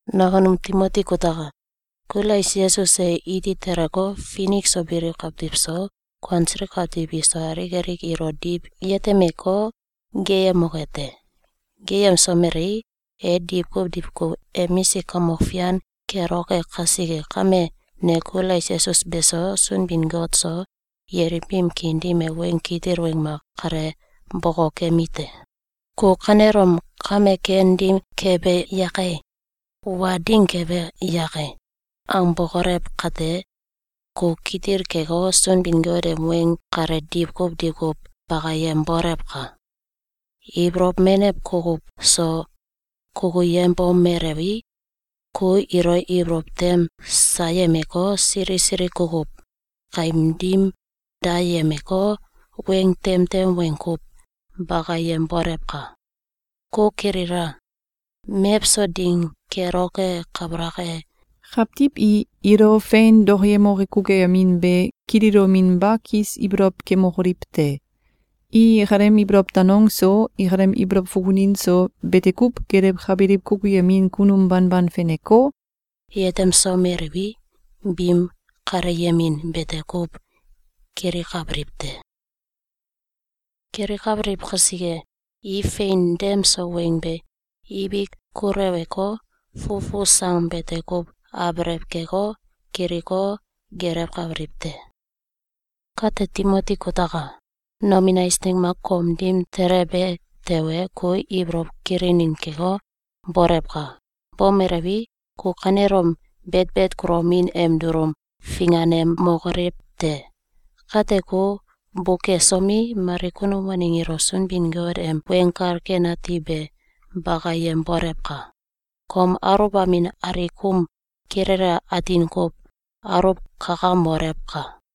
Nakunum Timoti kutaka! Kulais Yesus e iti teleko, finik so biliw kawtiw so, kuansiliw kawtiw iso alik alik ilo diw yetemeko, geeyemoke te. Geeyemsomelei, e diwkuw diwkuw emisik kamok fian keloke kasike kame, ne Kulais Yesus beso, Sunbin-Got so, yelim biim kiin dim e weng kitil weng mak kale bokokemite: Ku kanelom “Kame ken ding kebe yake? Wa ding kebe yake?”, angbokolew kate, ku kitil keko, Sunbin-Got em weng kale diwkuw diwkuw bakayembolewka! Ibolow menew kukuw so kukuyembomelewi, ku ilo ibolow tem sayemeko, sili sili kukuw kaim dim dayemeko, weng temtem weng kuw bakayembolewka! Ku kilila! Mewso ding keloke kabalak e, kawtiw i ilo fein dokoyemoke kukuyemin be kililominba kis ibolow kemokoliw te. I ikalem ibolow danong so, ikalem ibolow fukunin so, bete kuw gelewkabiliw kukuyemin kunum banban feneko, yetemsomeliwi, biim kaleyemin bete kuw kilikabiliw te. Kilikabiliw kasike, i fein dem so weng be ibik kuleweko, fufu sang bete kuw abelew keko, kiliko, gelewkabiliw te. Kate Timoti kutaka! Nomin eisneng mak kom dim telebe tewe, ku ibolow kilinin keko, bolewka! Bomelewi, ku kanelom betbet kulomin em dulum finganemokolew te! Kate ku bukesomi, mali kunum waneng ilo Sunbin-Got em Weng Kal Ken Ati be bakayembolewka! Kom aluwbamin alikum kilele atin kuw aluwkakamolewka!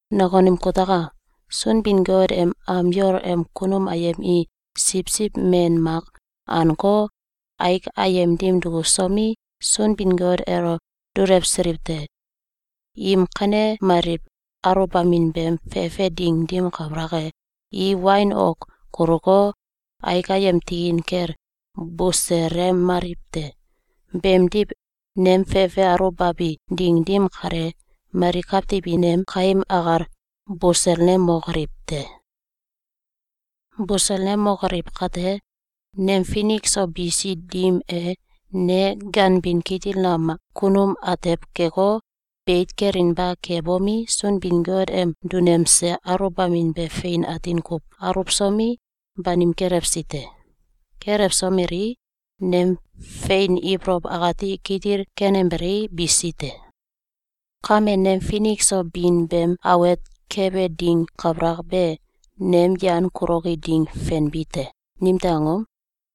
Nakunum kutaka! Sunbin-Got em am yol em kunum ayem i siwsiw men mak anko, aik ayem dim duksomi, Sunbin-Got elo dulewsiliw te. Im kanemaliw aluwbamin beem fefe ding dim kabalak e, i wain ok kuluko, aik ayem tikin kel buselemaliw te. Beemdiw, nem fefe aluwbabi ding dim kale, mali kawtiw i nem kaim akal buselnemokoliw te. Buselnemokoliw kate, nem finik so bisi dim e, ne ganbin kitil nam kunum atew keko, beit kelinba kebomi, Sunbin-Got em dunemse aluwbamin be fein atin kuw aluwsomi, banim kelewsi te. Kelewsomelii, nem fein ibolow akati kitil kenembelei, bisi te. Kame, nem finik so bin beem awet kebe ding kabalak be, nem yan kuloki ding fenbi te. Nimtew angom?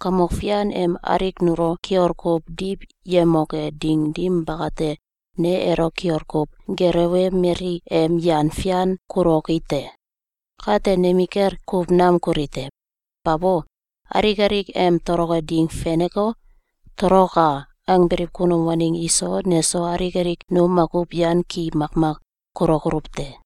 Kamok Fian em alik nulo kiol kuw diw yemoke ding dim bakate, ne elo kiol kuw gelewemeli em yan fian kuloki te. Kate nemikel kuw nam kuli te. Babo! Alik alik em toloke ding feneko, “Toloka!”, angbiliw kunum waneng iso neso alik alik nu makuw yan ki makmak kulokoluw te.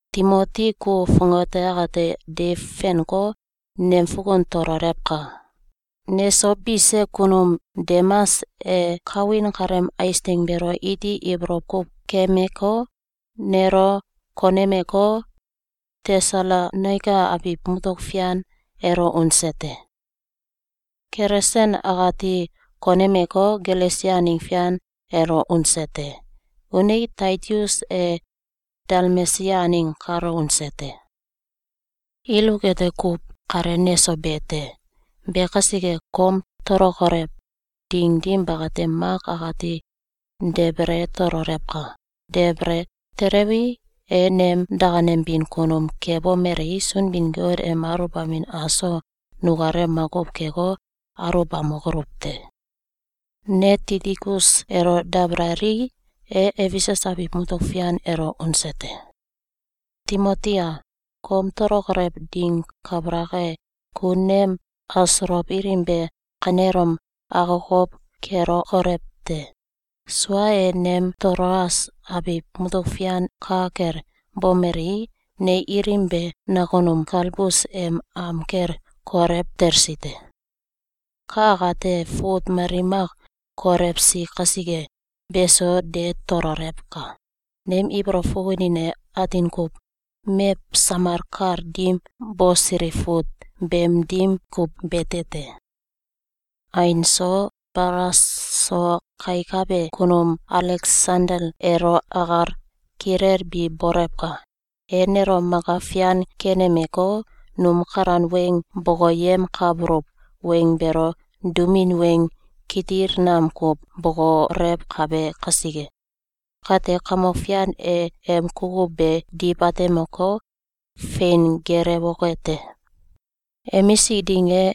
Timoti, ku fongate akate deiw fenko, nem fukun tololewka! Neso bise kunum Demas e kawin kaleem eisneng beelo iti ibolow kuw keemeko, nelo konemeko, Tesalonaika abiw mutuk fian elo unese te. Kelesens akati konemeko, Galesia aneng fian elo unese te. Unei, Taitus e Dalmesia aneng kalo unese te. Iluk ete kuw kale neso be te. Be kasike, kom tolokolew ding dim bakate, Mak akati debele tololewka! Debele telewi, e nem dakanembin kunum kebomelei, Sunbin-Got em aluwbamin aso nukalem makuw keko, aulbamokoluw te! Ne Tikikus elo dabalalii, e Efesus abiw mutuk fian elo unese te. Timoti a! Kom tolokolew ding kabalak e, ku nem asolow ilim be kanelom akokow kelokolew te! Sua e, nem Toloas abiw mutuk fian ka kel bomelii, ne ilim be nakunum Kalbus em am kel kolew telsi te. Ka akate fut mali mak kolewsi kasike, beso de tololewka! Nem ibolow fukunin e atin kuw mew samal kal dim bosiliw fut beem dim kuw bete te. Ain so, balas so kaikabe kunum Aleksandel elo akal kilelbi bolewka! E nelo maka fian kenemeko, num kalan weng bokoyemkabuluw weng beelo dumin weng kitil nam kuw bokolewkabe kasike. Kate, Kamok Fian e em kukuw be diw atemeko, fein geelewoke te. Emisik ding e,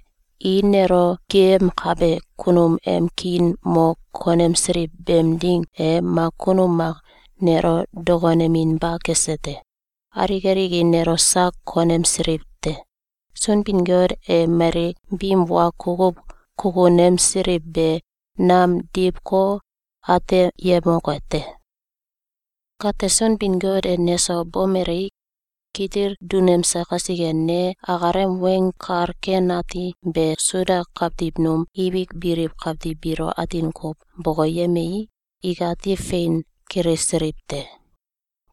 i nelo geeyemkabe kunum em kiin mo konemsiliw beem ding e, mak kunum mak nelo dokoneminba kese te. Alik alik i nelo sak konemsiliw te. Sunbin-Got e mali biim wa kukuw kukunemsiliw be nam diwko, ateyemoke te! Kate Sunbin-Got e neso bomelei, kitil dunemse kasike, ne akalem Weng Kal Ken Ati be Suda kawtiw num ibik biliw kawtiw biilo atin kuw bokoyemii, ikati fein kilisiliw te.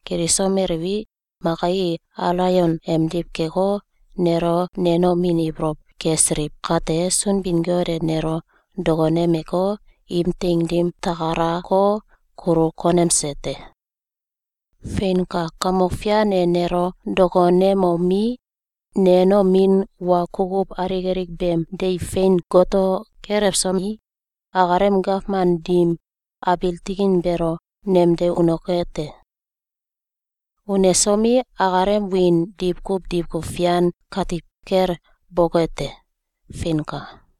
Kilisomeliwi, maka i alaion emdiw keko, nelo nenomin ibolow kesiliw kate, Sunbin-Got e nelo dokonemeko, im teing dim takalako, kulu konemse te. Feinka! Kamok Fian e nelo dokonemomi, nenomin wa kukuw alik alik beem deiw fein goto kelewsomi, akalem gawman dim abiil tikin beelo nemde unoke te. Unesomi, akalem wiin diwkuw diwkuw fian katiw kel boke te! Feinka!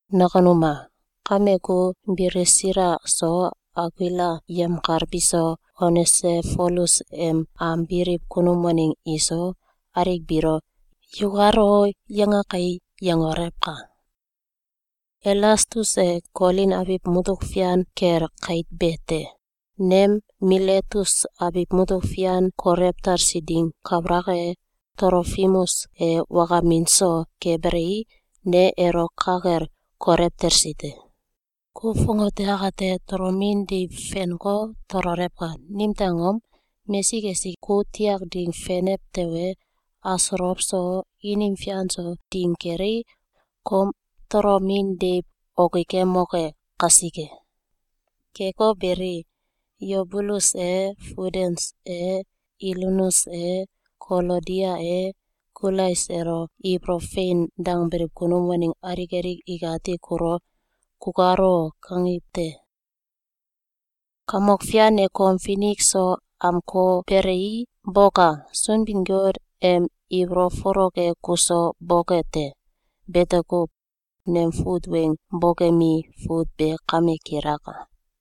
Nakunum a! Kame, ku Bilisila so Akuila yemkal biso, Onesifolus em am biliw kunum waneng iso, alik biilo “‘Yukal o!’, yanga kai!”, yangolewka! Elastus e Kolin abiw mutuk fian kel kait be te. Nem Miletus abiw mutuk fian kolew talsi ding kabalak e, Tolofimus e wakamin so kebelei, ne elo ka kel kolew telsi te. Ku fongate akate tolomin deiw fenko, tololewka! Nimtew angom? Mesik esik ku tiak ding fenew tewe, asolow so, inim fian so ding kelei, kom tolomin deiw okikemoke kasike. Keko beli, Yubulus e, Fudens e, Ilinus e, Kolodia e, Kulais elo ibolow fein dangbiliw kunum waneng alik alik ikati kulo “Kukal o!”, kangiw te. Kamok Fian e kom finik so amkobelei, boka! Sunbin-Got em ibolow folok e kuso boke te. Bete kuw. Nem fut weng bokemi fut be kame kilaka.